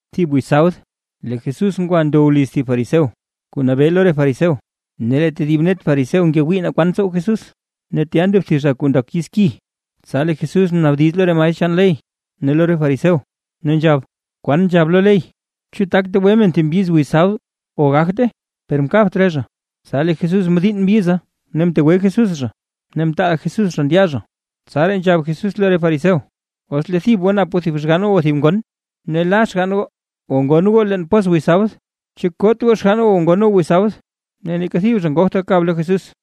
Thib wiz sabd, lee Jesús ngwa ndow liz thib fariseo, kuu nabee lo re fariseo, ne lee tedib net fariseo ngewii naa kwan tsow Jesús. Ne tya ndo thib zha kuu ndak yiz ki. Tsa lee Jesús mnaabdiz lo re maestr chaan ley ne lo re fariseo, ne nzhab: ―¿Kwan nzhab lo ley? ¿Chu tak tegwe men thib mbyiz wiz sabd o gagte? Per mkabt re zha. Tsa lee Jesús mdiinn mbyiza ne mtegwe Jesús zha ne mtaal Jesús zha ndya zha. Tsaraa nzhab Jesús lo re fariseo: ―Os lee thib goo nap thib xgann o thib ngon, ne la xgann goo o ngon goo leen pos wiz sabd, ¿chu koot goo xgann goo o ngon goo wiz sabd? Ne neeka thib zha ngogt gakab lo Jesús.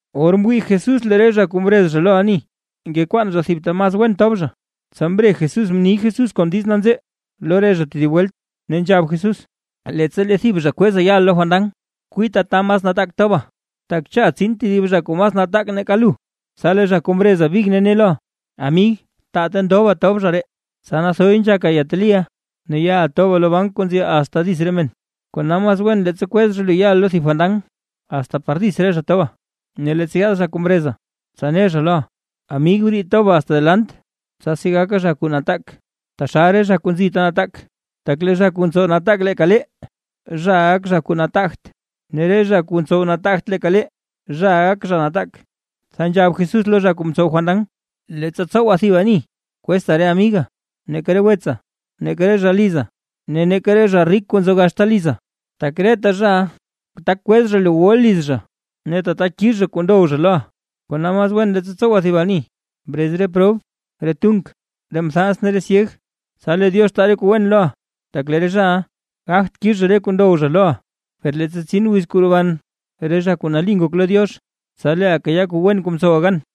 Or mwii Jesús lee re zha kuu mrez zha lo ani, ngekwaan zha thib ta mas wen tob zha, tsa mre Jesús mni Jesús kon diiz nanzee lo re zha tedib welt, ne nzhab Jesús: ―Leettsa lee thib zha kweza yaʼa fandan, kwiita ta mas nataak toba, tak cha tsin tedib zha kuu mas nataak nake lu, tsa lee zha kuu mreza big ne loʼa: “Amig taa ta ndoba tob zha ree”. Tsa nathoy nzhaka yeteliʼa ne yaʼa toba lo bank kuu nzi asta dits re men. Kona mas wen leettsa kwez zha lu yaʼa lo thib fandan, asta par dits re zha toba, ne leettsa yaad zha kuu mreza, tsa ne zha loʼa: “Amig, briid toba asta delant”. Tsasi gaka zha kuu nataak taxal re zha kuu nzi ta nataak. Tak lee zha kuu ntsow nataak leeka lee, zhaʼa gak zha kuu nataagt, ne lee re zha kuu ntsow nataagt leeka lee, zhaʼa gak zha nataak. Tsa nzhab Jesús lo zha kuu mtsow fandan: ―Leettsa tsowa thib ani, kwezta re amiga, neeka re wetsa, neeka re zha liza, ne neeka re zha rik kuu nzo gaxta liza; tak reta zhaʼa tak kwez zha lu wuʼa liz zha, ne tata kix zha kuu ndow zha loʼa. Kona mas wen leettsa tsowa thib ani, brez re prob, re tunk, re mthans ne re zha syeg, tsa lee Diox taa re kuu wen loʼa, tak lee re zhaʼa gagt kix zha re kuu ndow zha loʼa, per leettsa tsin wiz kuu roban re zha kuu nali ngok lo Diox, tsa leeʼa kayaa kuu wen kuu mtsowa gan.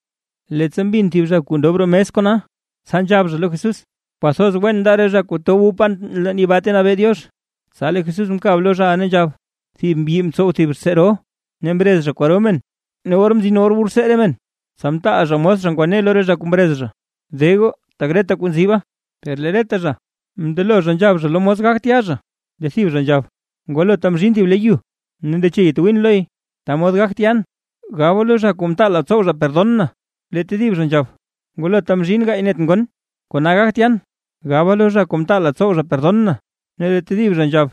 Leettsa mbin thib zha kuu ndob roo mes kona, tsa nzhab zha lo Jesús: ―Kwathoz wen nda re zha kuu tab wu pan leen yibaa ta nabee Diox. Tsa lee Jesús mkab lo zhaʼa ne nzhab: ―Thib mbyi mtsow thib rtsee ro, ne mrez zha kwaro men. Ne or mzin or kuu wu rtsee re men, tsa mtaal zha mos zha ngwane lo re zha kuu mrez zha: “De goo, tak reta kuu nziba”. Per lee reta zha mndelo zha nzhab zha lo mos gagt ya zha. Lee thib zha nzhab: “Ngwalota mzhiin thib le yu, ne ndeche yatwiin loy, ta mod gagt yan; gaba lo zha kuu mtaala tsow zha perdon na”. Lee tedib zha nzhab: “Ngwalota mzhiin gaay net ngon, kona gagt yan; gaba lo zha kuu mtaala tsow zha perdon na”. Ne lee tedib zha nzhab: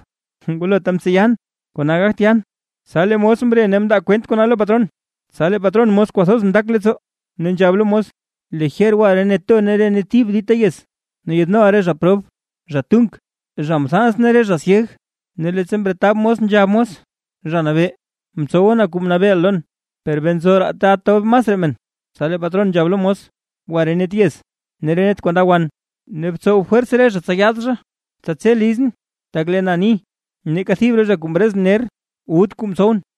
“Ngwalota mtseyan, kona gagt yan”. Tsa lee mos mre ne mndaa kwent kona lo patron. Tsa lee patron mos kwathoz mndak leettsoo, ne nzhab lo mos: “Lijer gwa re net to ne re net thib dita yez, ne yaadnoʼa re zha prob, zha tunk, zha mthans ne re zha syeg”. Ne leettsa mretab mos nzhab mos: “Zha Nabee, mtsowa na kuu mnabeeʼa lon, per bee nzo raa ta tob masraa men”. Tsa lee patron nzhab lo mos: “Gwa re net yez ne re net kuu nda wan, ne btsow fwers re zha tsa yaad zha, tsa tse lizʼn. Tak lee na ni, neeka thib re zha kuu mrezʼn ner, wut kuu mtsowʼn.”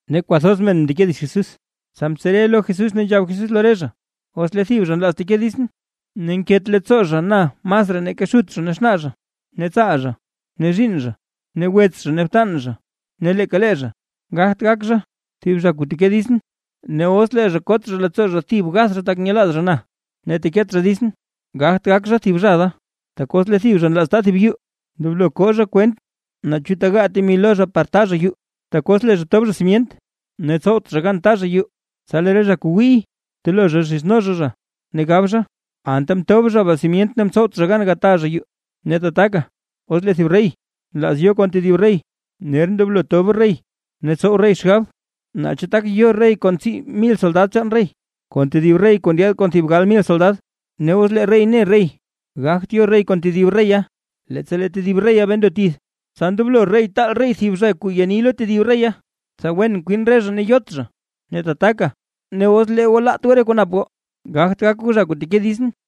Ne kwathoz men mndeke dits Jesús, tsa mtsere lo Jesús ne nzhab Jesús lo re zha: ―Os lee thib zha nlaaz teke ditsʼn, ne nket leettsoo zha na masraa nake xut zha ne xnaa zha, ne tsaal zha, ne zhiinn zha, ne wets zha ne btan zha ne leeka lee zha, gagt gak zha, thib zha kuu teke ditsʼn. Ne os kot zha leettsoo zha thib gath zha tak nyelaaz zha na, ne teket zha ditsʼn, gagt gak zha thib zha da. Tak os lee thib zha nlaaz ta thib yuu, ndoblo koo zha kwent naa chu tegaa temi lo zha par taa zha yuu. Tak os lee zha tob zha simyent ne tsowt zha gan taa zha yuu, tsa lee re zha kuu wiiy telo zha zhizno zha zha, ne gab zha: “Anta mtob zha baa simyent ne mtsowt zha gan gata zha yuu”. Ne tataka, os lee thib rey, nlaaz yo kon tedib rey, ner ndoblo tob rey ne tsow rey xgab, naa chu tak yo rey kon tsii mil soldad chaan rey, kon tedib rey kuu ndyaad kon thib gal mil soldad. Ne os lee rey ne rey gagt yo rey kon tedib reya; leettsa lee tedib reya bee ndo tith, tsa ndoblo rey taal thib zha kuu ya ni lo tedib reya, tsa wen kwin re zha ne yot zha. Ne tataka, os lee goo laat goo re kuu nap goo, gagt gak goo zha kuu teke ditsʼn.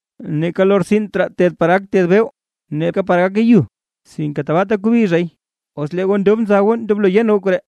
Neeka lortsin raa ted par gak ted beww, neeka par gake yu sinke tabaata kobi zhay. ¡Os lee goo ndob nza goo ndoblo yen goo koree!